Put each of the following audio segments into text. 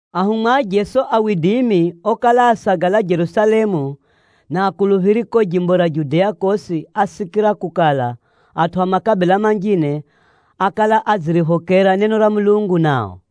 Ahumwa a Jeso okala asagala Jerusalemu, na akuluphiri ko jimbo ra Judea kosi ásikira kukala, atʼu a makabila manjine ákala adziriphokera neno ra Mulungu nao.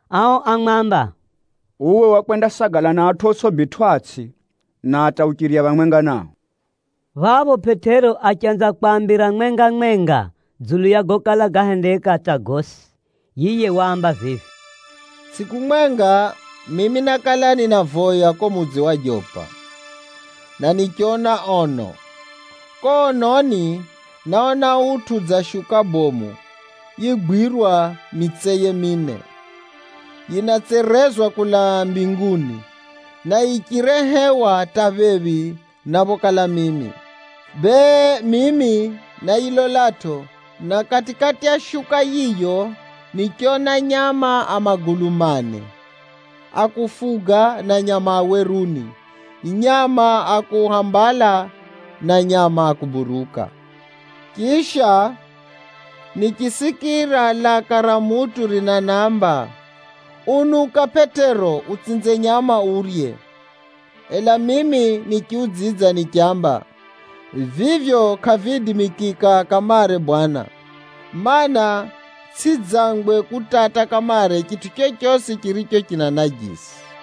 Ao ámwamba, “Uwe wakwendasagala na atʼu otsʼibitwʼatsʼi, na hata uchirya phamwenga nao!” Phapho Pʼetero achanza kwaambira mwenga-mwenga dzulu ya gokala gahendeka hata gosi. Yiye waamba vivi, “Tsʼiku mwenga, mimi nákala ninavoya ko mudzi wa Jopa, na nichona ono. Ko ononi, náona utʼu dza shuka bomu yigwirwa mitseye mine, yinatserezwa kulaa mbinguni, na yichirehewa hata phephi na phokala mimi. Bee, mimi náyilolatʼo, na kati-kati ya shuka yiyo, nichona nyama a magulu mane a kufuga na nyama a weruni, nyama a kuhambala na nyama a kuburuka. Chisha, nichisikira laka ra mutʼu rinanamba, ‘Unuka Pʼetero, utsinze nyama urye!’ Ela mimi nichiudzidza nichamba, ‘Vivyo kʼaviidimikika kamare Bwana, mana, tsʼidzangwe kutata kamare chitʼu chochosi chiricho ni najisi.’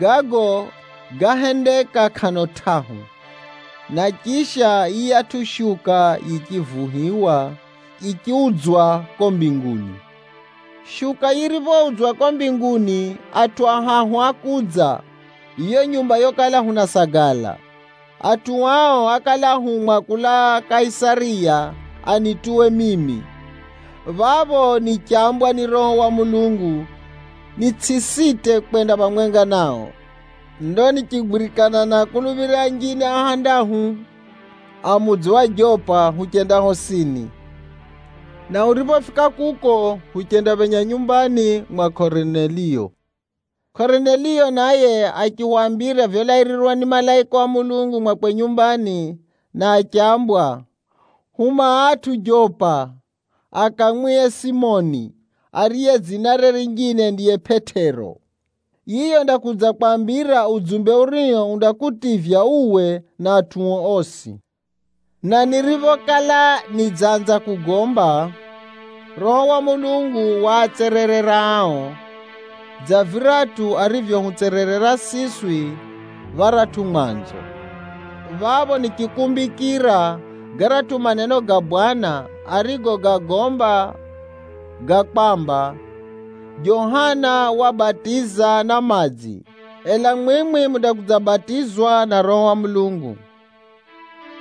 Gago gáhendeka kʼano tʼahu, na chidzako vitʼu vivi vyosi vichiudzwa ko mbinguni. “Shuka yiriphoudzwa ko mbinguni, atʼu ahahu ákudza yo nyumba yokala hunasagala. Atʼu ao ákala áhumwa kulaa Kaisariya anituwe mimi. Phapho nichambwa ni Roho wa Mulungu, nitsʼisite kwenda phamwenga nao. Ndo nichigwirikana na akuluphiri anjine ahandahu a mudzi wa Jopa huchenda hosini. Na huriphofika kuko, huchendaphenya nyumbani mwa Korineliyo. Korineliyo naye achihwambira vyolairirwa ni malaika wa Mulungu mwakwe nyumbani, na achambwa, ‘Huma atʼu Jopa akamwihe Simoni, ariye dzinare rinjine ndiye Pʼetero. Yiye undakudzakwambira udzumbe urio undakutivya uwe na atʼuo osi.’ Na niriphokala nidzanza kugomba, Roho wa Mulungu waatsererera ao, dza viratʼu arivyohutsererera siswi pharatʼu mwanzo. Phapho nichikumbikira garatʼu maneno ga Bwana arigogagomba ga kwamba, ‘Johana wabatiza na madzi, ela mwimwi mundakudzabatizwa na Roho wa Mulungu.’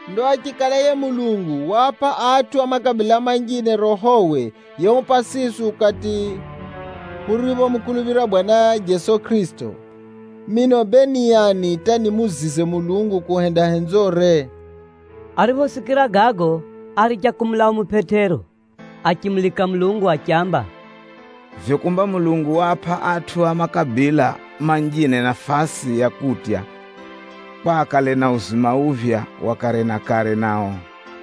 Ndo achikala yiye Mulungu waapʼa atʼu a makabila manjine Rohowe yehupʼa siswi ukati huriphomukuluphira Bwana Jeso Kʼirisito, mino bee ni ani hata nimuzize Mulungu kuhenda henzore?” Ariphosikira gago, áricha kumulaumu Pʼetero achimulika Mulungu achiamba, “Vivyo kumba Mulungu waapʼa atʼu a makabila manjine nafasi ya kutya kwa akale na uzima uphya wa kare na kare nao!”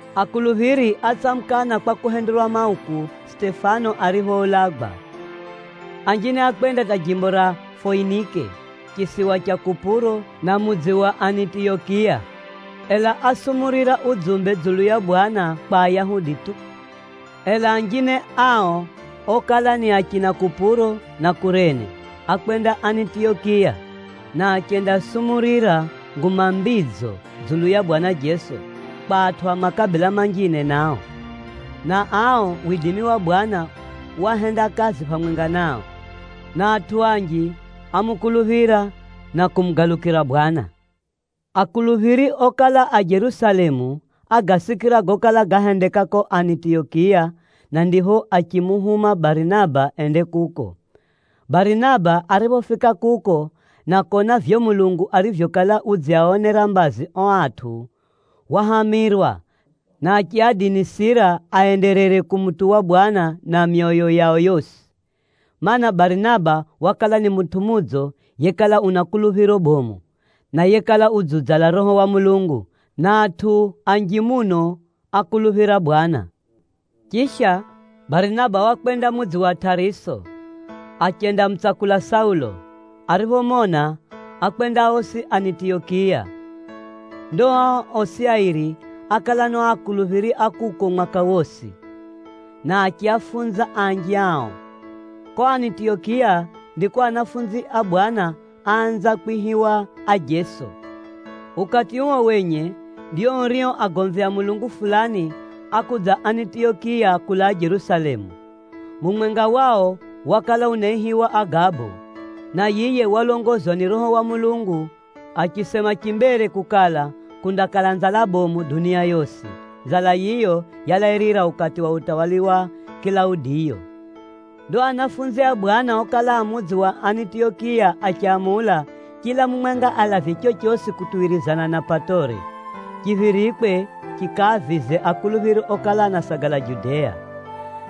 Akuluphiri átsamukana kwa kuhenderwa mauku, Sitefano ariphoulagwa. Anjine ákwenda hata jimbo ra Foinike, chisiwa cha Kupuro na mudzi wa Anitiyokiya, ela ásumurira udzumbe dzulu ya Bwana kwa Ayahudi tu. Ela anjine ao okala ni achina Kupuro na Kurene, ákwenda Anitiyokiya, na achendasumurira Nguma Mbidzo dzulu ya Bwana Jeso, kwa atʼu a makabila manjine Chiyunani chinaamba: Ayunani nao. nao. Na ao, widimi wa Bwana wahenda kazi phamwenga nao, na atʼu anji ámukuluphira na kumugalukira Bwana. Akuluphiri okala a Jerusalemu ágasikira gokala gahendeka ko Anitiyokiya, na ndipho achimuhuma Barinaba ende kuko. Barinaba ariphofika kuko na kona vivyo Mulungu arivyokala udziaonera mbazi o atʼu, wahamirwa na achiadinisira aenderere kumutuwa Bwana na myoyo yao yosi. Maana, Barinaba wakala ni mutʼu mudzo yekala una kuluphiro bomu, na yekala udziudzala Roho wa Mulungu, na atʼu anji muno ákuluphira Bwana. Chisha, Barinaba wakwenda mudzi wa Tʼariso, achendamutsakula Saulo. Ariphomona, ákwenda osi Anitiyokiya. Ndo ao osi airi ákala na o akuluphiri a kuko mwaka wosi, na achiafunza anji ao. Ko Anitiyokiya ndiko anafunzi a Bwana áanza kwihiwa ajeso. Ukati uo wenye, ndio urio agomvi a Mulungu fulani ákudza Anitiyokiya kulaa Jerusalemu. Mumwenga wao wakala unaihiwa Agabo, na yiye walongozwa ni Roho wa Mulungu achisema chimbere kukala, kundakala nzala bomu dunia yosi. (Nzala yiyo yalairira ukati wa utawala wa Kilaudiyo). Ndo anafunzi a Bwana okala a mudzi wa Anitiyokiya achamula, chila mumwenga alavye chochosi kutuwirizana na patore, chiphirikwe chikaavize akuluphiri okala anasagala Judea.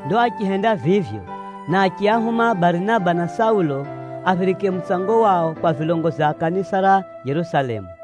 Ndo achihenda vivyo, na achiahuma Barinaba na Saulo, aphirike mutsango wao kwa vilongozi a kanisa ra Jerusalemu.